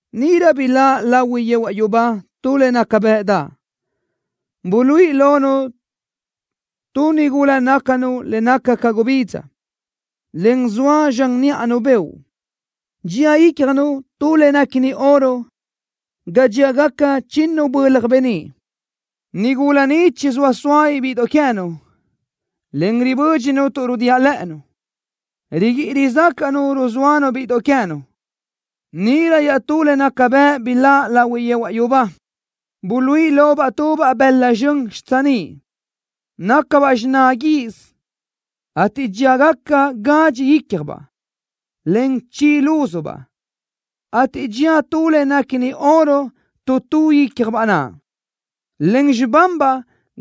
Níʼirö biláʼ lahui yehuaʼ yubá tu le naca bëʼdaʼ, buluíʼi lonu tu nigula nácunu le naca ca gubidza, en zoa zxan níʼanu beoʼ. Dxía ícjanu tu le néquini oro ga dxíagacabaʼ chinnu bölaj beníʼ. Nigula ni chizóa soa bíʼidoʼ queë́nu, en ribö́dxinu tuʼ rúdiaʼ lë́ʼënu. Riguíʼi rizácaʼnu ruzóanu bíʼidoʼ queë́nu. Níʼirö iaʼtú le naca bëʼ biláʼ lahui yehuaʼ yubá. Buluíʼi lobaʼ tubaʼ bëla zxön xitsiníʼ. Nácabaʼ xiná guiʼis, ateʼ dxíagaca gadxi ícjabaʼ, en chi lúzubaʼ, ateʼ dxía tu le néquini oro tu tu ícjabaʼ naʼ. Len xibanbaʼ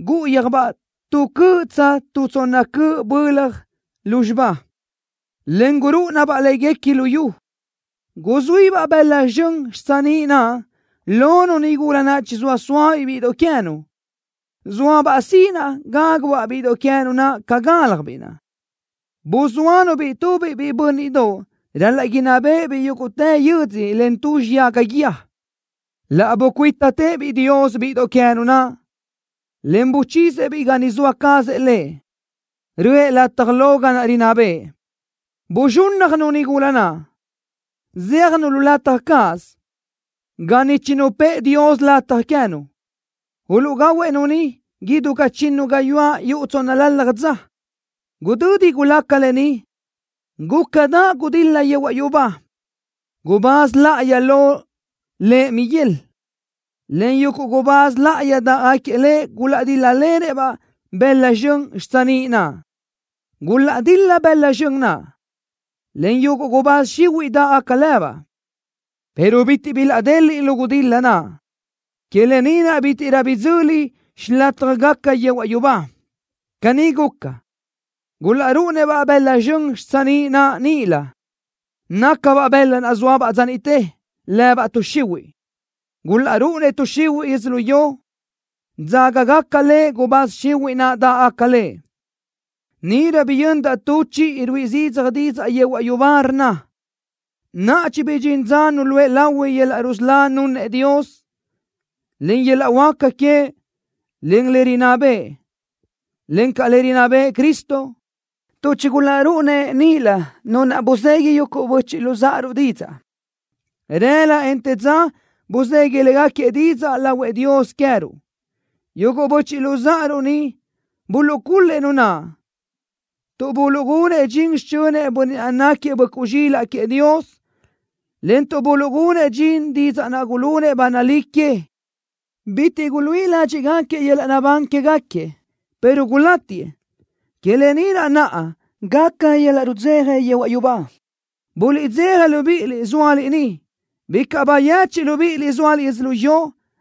gúʼuyöjbaʼ tu cöʼ tsa tu tsonna cöʼ bölaj lúzxiba, en gurúʼunabaʼ légacabaʼ luyú. Guzuíbaʼ bëla zxön xitsiníʼ naʼ lonu nigula naʼ chizóa sóabiʼ bíʼidoʼ queë́nu. Zóabaʼ sinaʼ gágubaʼ-biʼ bíʼidoʼ queë́nu naʼ ca gáljabiʼ naʼ. Buzóanu-biʼ tubiʼ biʼi bö́nniʼdoʼ ral-laʼ inná béʼebiʼ yúguʼtë yödzö len tu xiyaga guíë. Laʼ bucuítatëʼë-biʼ Dios bíʼidoʼ queë́nu naʼ, en buchisëʼ-biʼ ga niʼ zoa cazëʼ Lëʼ, röʼë lataj lo ga naʼ rinná bëʼë. Buzxúnnajnu nigula naʼ, zéajnu lu lataj cáʼasö, ga niʼ chinupë́ʼë Dios lataj queë́nu. Uluʼgahuëʼ-nu niʼ idú ca chinnu gayuáʼ yuʼ tsónnalalaj dza. Gudödi gulaca lë ni, gúcadaʼ gudil-la yehuaʼ yubá. Gubáz láʼayi lo lëʼ Miguel, en yuguʼ gubáz láʼayi dáʼgaquiëʼ lëʼ gulaʼdíl-lalenëʼ-baʼ bëla zxön xitsiníʼ naʼ. Gulaʼdil-la bëla zxön naʼ, en yuguʼ gubáz xihuiʼ dáʼgaca lëbaʼ pero bitiʼ bilaʼdeliʼ lu gudil-la naʼ. Que lë ni naʼ bítiʼrö bidzöli xilátjagaca yehuaʼ yubá. Caní guca, gulaʼrúʼunëʼ-baʼ bëla zxön xitsiníʼ naʼ níʼilö. Nácabaʼ bëla naʼ zóabaʼ dza niʼte, lëbaʼ tuʼ xihuiʼ. Gulaʼrúʼunëʼ tuʼ xihuiʼ yödzölió, dzágagaca le gubáz xihuiʼ naʼ dáʼgaca le. Níʼirö biyöndaʼ tu chiʼi ruíʼi zidzaj didzaʼ yehuaʼ yubá, rnna: “Naʼa chibidxín dza nuluʼë lahui yöl-laʼ rusölá nunëʼ Dios, en yöl-laʼ huáca queëʼ, en le rinná bëʼë, encaʼ le rinná bëʼë Cristo, tuʼ chigulaʼrúʼunëʼ níʼilö nu naʼ buzegui yuguʼ böchiʼ luzáʼaruʼ didzaʼ. Rëla, en të dza buzegui légaquiëʼ didzaʼ lahuëʼ Dios queë́ruʼ. Yuguʼ böchiʼ luzáʼaruʼ ni buluʼcul-lëʼ nu naʼ, tuʼ buluʼgunëʼ dxin xichönëʼ Bönniʼ naʼ náquiëʼ Böʼcuʼ Zxílaʼdoʼ queëʼ Dios, en tuʼ buluʼgunëʼ dxin didzaʼ naʼ gulunëʼ ba nalí queëʼ. Bitiʼ guluíʼi ládxiʼgaquiëʼ yöl-laʼ naʼbán quégaquiëʼ, pero gulátiëʼ. Que lë ni naʼ gaca yöl-laʼ rudzeja yehuaʼ yubá. ¡Buliʼdzeja libíʼiliʼ, zóaliʼ niʼ! ¡Bicaʼ bayechiʼ libíʼiliʼ zóaliʼ yödzölió,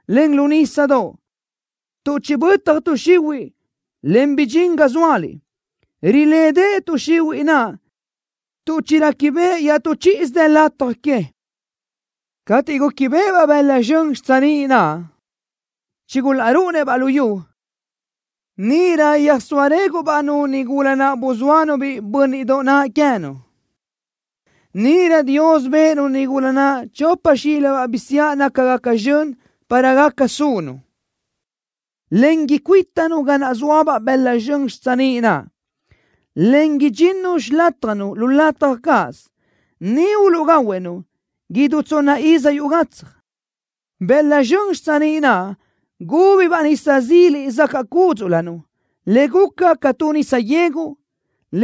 en lu nísadoʼ, tuʼ chibötaj tuʼ xihuiʼ, en bidxín ga zóaliʼ! Rilédeʼe tuʼ xihuiʼ naʼ tuʼ chiréquibeʼe iaʼtú chíʼisö dë lataj que.” Cateʼ gúquibeʼebaʼ bëla zxön xitsiníʼ naʼ chigulaʼrúʼunëʼ-baʼ luyú, níʼirö yöjsóa réguʼbaʼ-nu nigula naʼ buzóanu biʼi bö́nniʼdoʼ naʼ queë́nu. Níʼirö Dios bëʼë-nu nigula naʼ chopa xílibaʼ bisiáʼ nácagaca zxön para gaca sunu, en icuítanu ga naʼ zóabaʼ bëla zxön xitsiníʼ naʼ, en idxinnu xilátjanu lu lataj cáʼasö. Niʼ uluʼgahuëʼ-nu idú tsonna iz yuʼ gatsaj. Bëla zxön xitsiníʼ naʼ gúbabaʼ nisa zile zacaʼ cúdzuʼlönu, le guca ca tu nisa yegu,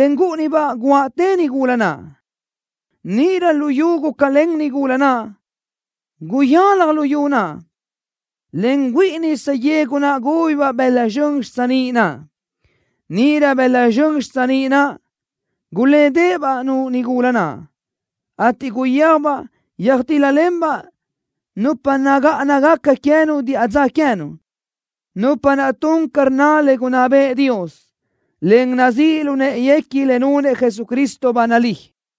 en gúʼunibaʼ guaʼtë nigula naʼ. Níʼirö luyú gúcalen nigula naʼ. Guyalaj luyú naʼ, en güíʼi nisa yegu naʼ gúbabaʼ bëla zxön xitsiníʼ naʼ. Níʼirö bëla zxön xitsiníʼ naʼ gulédeʼebaʼ-nu nigula naʼ, ateʼ guyéajbaʼ yöjtíl-lalenbaʼ nupa nagáʼanagaca queë́nu diʼa dza queë́nu, nupa naʼ tun ca rnna le gunná bëʼë Dios, en nazíʼ lu në́ʼeguequi le nunëʼ Jesucristo ba nalí.